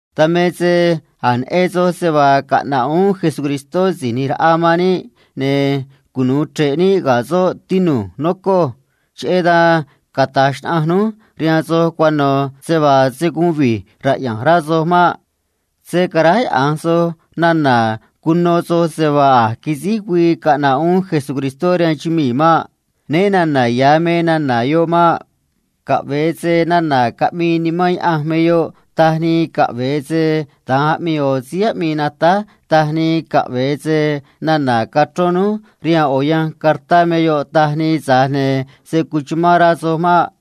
Dan me se a̱j neꞌen soj se vaa caꞌna̱ꞌ uún Jesucristó Si̱j ꞌNi̱j Raꞌa man níꞌ, ne̱ cunu̱u chre̱ꞌ níꞌ ga̱ soꞌ, tinu̱j, nocoj. Cheꞌé dan rquee̱ núj rihaan soj cuano̱ se vaa se̱ guun vi̱j raꞌya̱nj rá soj maꞌ. Se̱ caráyaꞌa̱nj soj nana̱ cuno soj se vaa a̱j quisíj güii caꞌna̱ꞌ uún Síí ꞌNi̱j Raꞌa man níꞌ rihaan chumii̱ maꞌ. Né na̱na̱ ya̱ me nana̱ yoꞌ maꞌ. Caꞌve̱e se nana̱ caꞌmii Nimán Yaꞌanj me yoꞌ taj nii, caꞌve̱e se da̱nj aꞌmii ꞌo̱ síí aꞌmii natáj taj nii, caꞌve̱e se nana̱ cachrón núj rihaan ꞌo̱ yanj cartá me yoꞌ taj nii, tza̱j ne̱ se̱ cuchumán rá soj maꞌ.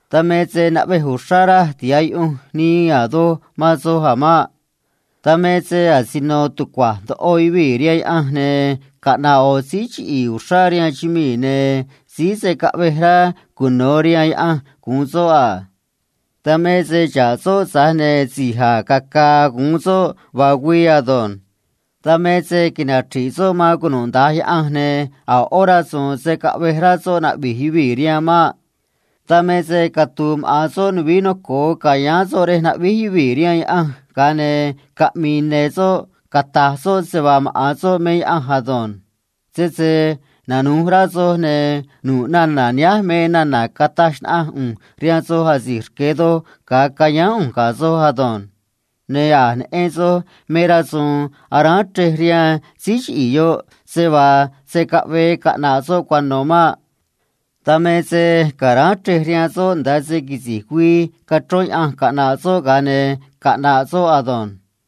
Dan me se naꞌvej uxrá raj tiha̱ꞌ yuꞌunj nii a̱ doj man soj a̱ maꞌ. Dan me se asino tucua̱j ndoꞌo yuvii̱ rihaan Yaꞌanj, ne̱ caꞌna̱ꞌ ꞌo̱ síí chiꞌi̱i̱ uxrá rihaan chumii̱, ne̱ síí se̱ caꞌvej rá cuno̱ rihaan Yaꞌanj gu̱un soꞌ a. Dan me se xa̱ꞌ soꞌ, tza̱j ne̱ si̱j a̱j caca̱a̱ gu̱un soꞌ vaa güii ado̱nj. Dan me se nachri̱ꞌ soꞌ man cunuda̱nj yaꞌanj, ne̱ a̱ ꞌó rasu̱u̱n se̱ caꞌvej rá soꞌ cara̱a̱ gue̱e̱ yuvii̱ rihaan maꞌ. Dan me se catu̱u̱ maꞌa̱n soꞌ nuvií noco̱o ca̱yáán soꞌ rej aráj gue̱e̱ yuvii̱ rihaan Yaꞌanj, ga̱a ne̱ caꞌmi̱i̱ ne̱ soꞌ cata̱j soꞌ se vaa maꞌa̱n soꞌ me Yaꞌanj ado̱nj. Sese nanu̱j rá soj, ne̱ nu̱ꞌ nana̱ nihánj me nana̱ cataj xnaꞌanj ꞌu̱nj rihaan soj asi̱j rque̱ doj ga̱a cayáán ꞌu̱nj ga̱ soj ado̱nj. Ne̱ a̱j neꞌen soj me rasu̱u̱n aráán chrej rihaan síí chiꞌi̱i̱ yoꞌ, se vaa se̱ caꞌvee caꞌna̱ꞌ soꞌ cuano̱ maꞌ. Dan me se ca̱ráán chrej rihaan soꞌ nda̱a se quisi̱j güii cachrón Yaꞌanj caꞌna̱ꞌ soꞌ, ga̱a ne̱ caꞌna̱ꞌ soꞌ ado̱nj.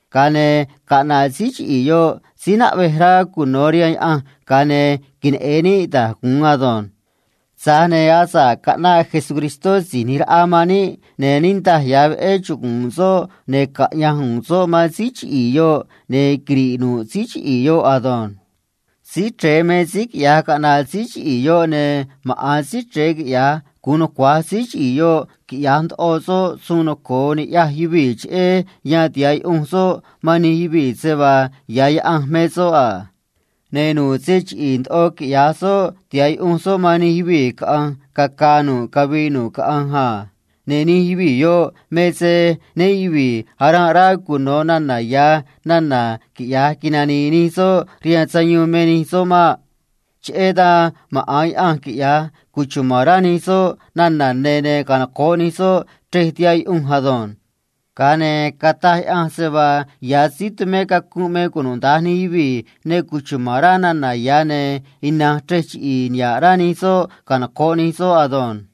Ga̱a ne̱ caꞌna̱ꞌ síí chiꞌi̱i̱ yoꞌ síí naꞌvej rá cuno̱ rihaan Yaꞌanj, ga̱a ne̱ queneꞌe̱n níꞌ da̱j gu̱un ado̱nj. Tza̱j ne̱ asa̱ꞌ caꞌnaꞌ Jesús Si̱j ꞌNi̱j Raꞌa man níꞌ, ne̱ niꞌndaj ya̱ veꞌé chugu̱u̱n soꞌ, ne̱ caꞌya̱nj u̱u̱n soꞌ man síí chiꞌi̱i̱ yoꞌ, ne̱ quiri̱ꞌ nu̱ꞌ síí chiꞌi̱i̱ yoꞌ ado̱nj. Síí Chre̱e me síí quiꞌya̱j caꞌna̱ꞌ síí chiꞌi̱i̱ yoꞌ, ne̱ maꞌa̱n Síí Chre̱e quiꞌya̱j gu̱un nucua̱j síí chiꞌi̱i̱ yoꞌ quiꞌya̱j soꞌ da̱j a̱ suun noco̱o ni̱ꞌyaj yuvii̱, cheꞌé yan tiha̱ꞌ yuꞌunj soꞌ man nij yuvii̱ se vaa ya̱ Yaꞌanj me soꞌ a. Ne̱ nu̱ꞌ se chiꞌi̱i̱ ndoꞌo quiꞌya̱j soꞌ, tiha̱ꞌ yuꞌunj soꞌ man nij yuvii̱ caꞌa̱nj caca̱a̱ nu̱ꞌ cavii nu̱ꞌ caꞌanj a. Ne̱ nij yuvii̱ yoꞌ me se né yuvi̱i̱ aranꞌ rá cuno̱ nana̱ ya̱ nana̱ quiꞌya̱j nani̱i̱ nij soꞌ rihaan sayuun me nij soꞌ maꞌ. Cheꞌé dan maꞌa̱n Yaꞌanj quiꞌya̱j cuchuma̱n rá nij soꞌ nana̱ ne̱, ne̱ canoco̱ꞌ nij soꞌ chrej tihaꞌ yuꞌunj ado̱nj. Ga̱a ne̱ cata̱j Yaꞌanj se vaa ya̱ síí tumé cacunꞌ me cunuda̱nj nij yuvii̱ ne cuchuma̱n rá nana̱ ya̱, ne̱ ina̱nj chrej chiꞌi̱i̱ niha̱ꞌ rá nij soꞌ canoco̱ꞌ nij soꞌ ado̱nj.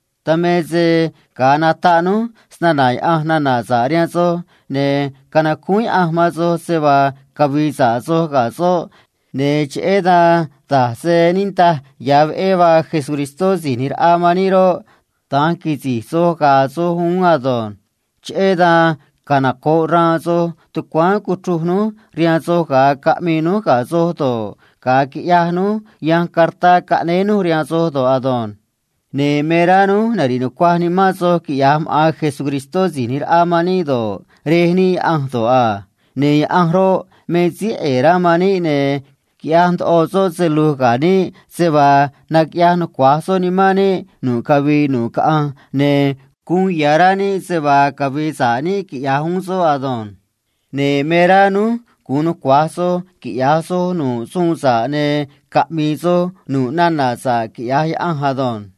Dan me se ga̱a nataꞌ núj nana̱ sa̱ꞌ cheꞌé Cristó rihaan soj, ne̱ canacúún Yaꞌanj man soj se vaa cavi̱i̱ sa̱ꞌ soj ga̱ soꞌ, ne̱ cheꞌé dan da̱j se niꞌndaj ya̱ veꞌé vaa Jesucristó Si̱j ꞌNi̱j Raꞌa man níꞌ roꞌ, da̱nj quisi̱j soj ga̱a̱ soj uún ado̱nj. Cheꞌé dan canoco̱ꞌ xraan soj tucuáán cuchruj núj rihaan soj ga̱a caꞌmii núj ga̱ soj do̱ꞌ, ga̱a quiꞌyaj núj yanj cartá caꞌnéé núj rihaan soj do̱ꞌ ado̱nj. Ne̱ me rá núj nari̱ꞌ nucuaj nimán soj, quiꞌya̱j maꞌa̱n Jesucristó Si̱j ꞌNi̱j Raꞌa man níꞌ do̱ꞌ, Rej níꞌ Yaꞌanj do̱ꞌ a. Ne̱ Yaꞌanj roꞌ, me síí ꞌe̱e̱ rá man níꞌ, ne̱ quiꞌyaj ndoꞌo soꞌ se lu̱j ga̱ níꞌ se vaa naquiꞌyaj nucua̱j soꞌ nimán níꞌ nu̱ꞌ cavii nu̱ꞌ caꞌanj, ne̱ uun ya̱ rá níꞌ se vaa cavi̱i̱ sa̱ꞌ níꞌ, quiꞌya̱j uún soꞌ ado̱nj. Ne̱ me rá núj gu̱un nucua̱j soj quiꞌya̱j soj nu̱ꞌ suun sa̱ꞌ, ne̱ caꞌmi̱i̱ soj nu̱ꞌ nana̱ sa̱ꞌ, quiꞌya̱j Yaꞌanj ado̱nj.